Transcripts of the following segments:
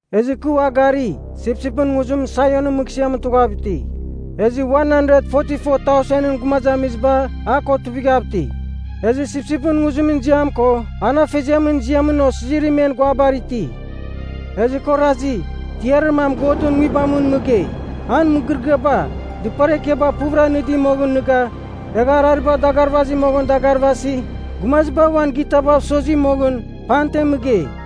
Ezɨ kɨ ua gari, sipsipɨn nguzim Sionɨn Mɨghsɨamɨn tughav iti. Ezɨ 144,000ɨn gumazamiziba a ko tuivighav iti. Ezɨ sipsipɨn nguzimɨn ziam ko an afeziamɨn ziamɨn osizirim men guabar iti. Ezɨ kɨ orazi, tiarir mam Godɨn Nguibamɨn mɨgei, an mɨgɨrɨgɨaba, dɨpar ekiaba puvɨra nɨdi moghɨn nɨga, egha arariba dagarvazi moghɨn dagarvasi, gumaziba uan gitabav sozi moghɨn, pamten mɨgei.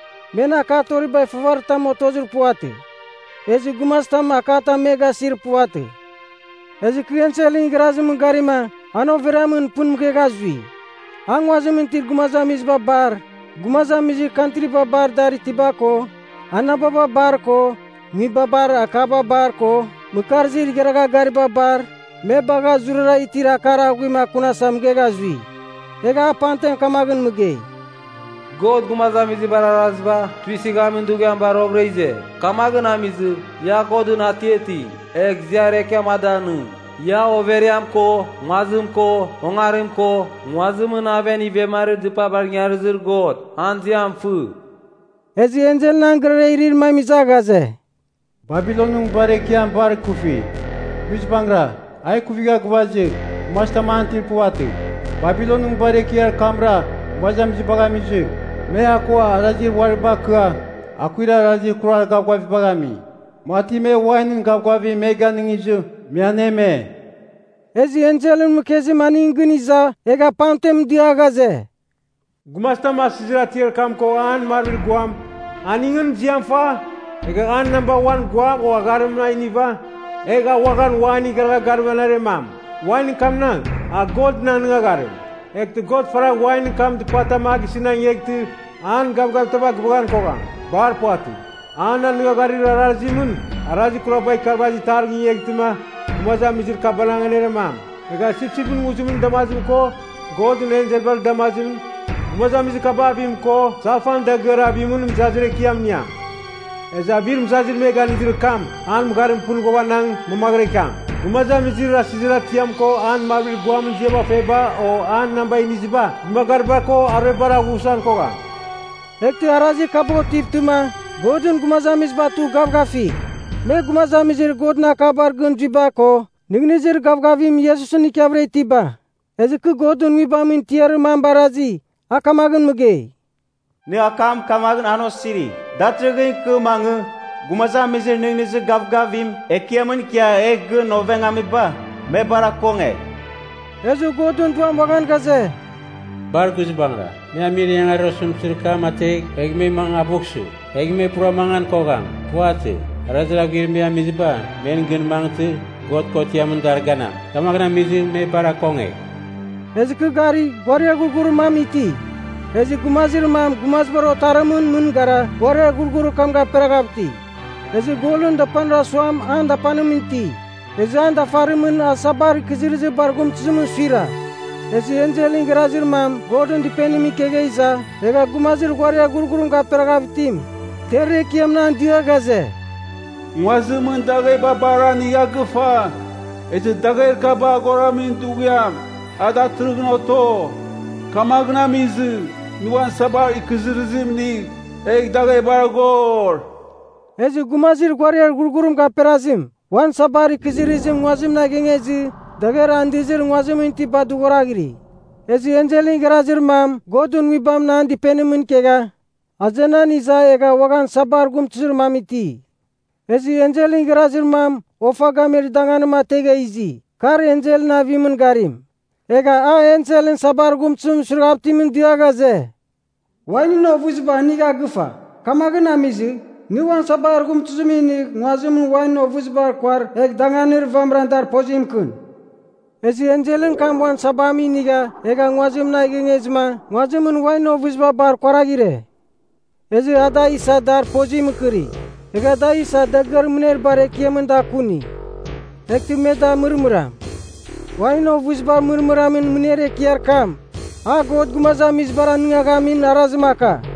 Men akatoribar ifavaritam otozir puvatɨ. Ezɨ gumazitam akatam me gasir puvatɨ. Ezɨ kɨ enselɨn igharazimɨn garima an overiamɨn pɨn mɨghegha zui. A nguazimɨn itir gumazamiziba bar, gumazamizir kantriba bar dar itiba ko, anababa bar ko, nguibabar akaba bar ko, mɨkarzir igharagha gariba bar, me bagha zurara itir akar aghuim akunasa mɨghegha zui. Egha a pamten kamaghɨn mɨgei, “God gumazamizibar arazibar tuisɨghamin dughiam bar roghɨra ize. Kamaghɨn amizɨ, ia Godɨn atiating, egh ziar ekiam a danɨng. Ia, overiam ko nguazim ko ongarim ko nguazimɨn aven ivemarir dɨpabar ingarizir God, an ziam fɨ.” Ezɨ enselɨn an gɨrara irir mam iza ghaze, “Babilonɨn Nguibar Ekiam bar ikufi. Guizbangɨra a ikuvigha gɨvazɨ gumazitam an itir puvatɨ. Babilonɨn Nguibar Ekiar kamra gumazamizibagh amizɨ, me a ko arazir uari bakɨa akuir arazir kurar gavgavibagh ami, mati me wainɨn gavgavim me ganɨngizɨ, me aneme.” Ezɨ enselɨn mɨkezim aningɨn gɨn iza egha pamten dia ghaze, “Gumazitam asɨzir atiar kam ko an marvir guam, aningɨn ziam fa, egha an namba uan guam o agharimɨn a iniva, egh a uaghan wainɨn igharagha garim aneremam. Wainɨn kamnang, a Godɨn anɨngagharim. Eghtɨ God faragh wainɨn kam dɨpatam a gisɨn a ingeghtɨ an gavgavitaba gɨvaghan kogham. Bar puvatɨ. An anɨngagharir arazimɨn, arazir kuraba ikarvazir itarim gingeghtɨma gumazamizir kaba aneremam. Egha sipsipɨn nguzimɨn damazim ko Godɨn enselbar damazimɨn, gumazamizir kaba avim ko salfan dagɨar avimɨn mɨzazir ekiam iniam. Ezɨ avir mɨzazim me ganɨdir kam, an mɨgharim pɨn ghuavanang mamaghɨra ikiam. Gumazamizir asɨzir atiam ko an marvir guamɨn ziam feba o an namba iniziba, dɨmagariba ko aruebar avughsan kogham.” Eghtɨ arazir kaba otivtɨma, Godɨn gumazamiziba tugh gavgafigh. Me gumazamizir Godɨn akabar gɨn zuiba ko nɨghnɨzir gavgavim Iesusɨn ikiavɨra itiba. Ezɨ kɨ Godɨn Nguibamɨn tiarir mam barazi, a kamagh mɨgei, “Nɨ akam kamaghɨn an osirigh. Datɨrɨghɨn ikɨ mangɨ, gumazamizir nɨghnɨzir gavgavim Ekiamɨn ikia egh gɨn ovengamiba, me bar akongegh.” Ezɨ Godɨn Duam uaghan ghaze, “Bar guizbangɨra. Me amir ingangarir osɨmtɨzir kam ategh, egh mangɨ avughsɨ. Egh me pura mangan kogham. Puvatɨ. Arazir aghuir me amiziba men gɨn mangɨtɨ God kotiamɨn dar ganam. Kamagh amizɨ, me bar akongegh.” Ezɨ kɨ gari, ghuariar ghurghurir mam iti, ezɨ gumazir mam gumazibar otarimɨn mɨn gara ghuariar ghurghurir kam gaperaghav iti. Ezɨ golɨn dapanir asuam an dapanimɨn iti, ezɨ an dafarimɨn a sabar ikɨzɨrɨzir bar ghumtɨzimɨn suira. Ezɨ enselɨn igharazir mam Godɨn Dɨpenimɨn ikegha iza, egha gumazir ghuariar ghurghurim gaperaghav itim, tiarir ekiamɨn an dia ghaze, “Nguazimɨn dagheba bar anigha gɨfa, ezɨ dagher kaba aghoramin dughiam a datɨrɨghɨn oto. Kamaghɨn amizɨ nɨ uan sabar ikɨzɨrɨzim inigh, egh daghebar aghor.” Ezɨ gumazir ghuariar ghurghurim gaperazim, uan sabar ikɨzɨrɨzim nguazimɨn a ighengezɨ, dagher andɨzir nguazimɨn itiba dɨghoraghiri. Ezɨ enselɨn igharazir mam Godɨn Nguibamɨn an dɨpenimɨn ikegha azenan iza egha uaghan sabar ghumtɨzir mam iti. Ezɨ enselɨn igharazir mam ofa gamir danganim ategha izi, kar enselɨn avimɨn garim. Egha a enselɨn sabar ghumtɨzimɨn suiraghav itimɨn dia ghaze, “Wainɨn ovɨziba anigha gɨfa. Kamaghɨn amizɨ, nɨ uan sabar ghumtɨzim inigh nguazimɨn wainɨn ovɨziba kuar egh danganir vamɨra dar pozim mɨkɨn.” Ezɨ enselɨn kam uan sabam inigha egha nguazimɨn a ighengezɨma nguazimɨn wainɨn ovɨziba bar kuaraghɨre. Ezɨ a da isa dar pozim mɨkɨri, egha da isa dagɨar mɨner bar ekiamɨn da akuni. Eghtɨ me da mɨrmɨram. Wainɨn ovɨzibar mɨrmɨramin mɨner ekiar kam, a God gumazamizibar anɨngaghamin arazim aka.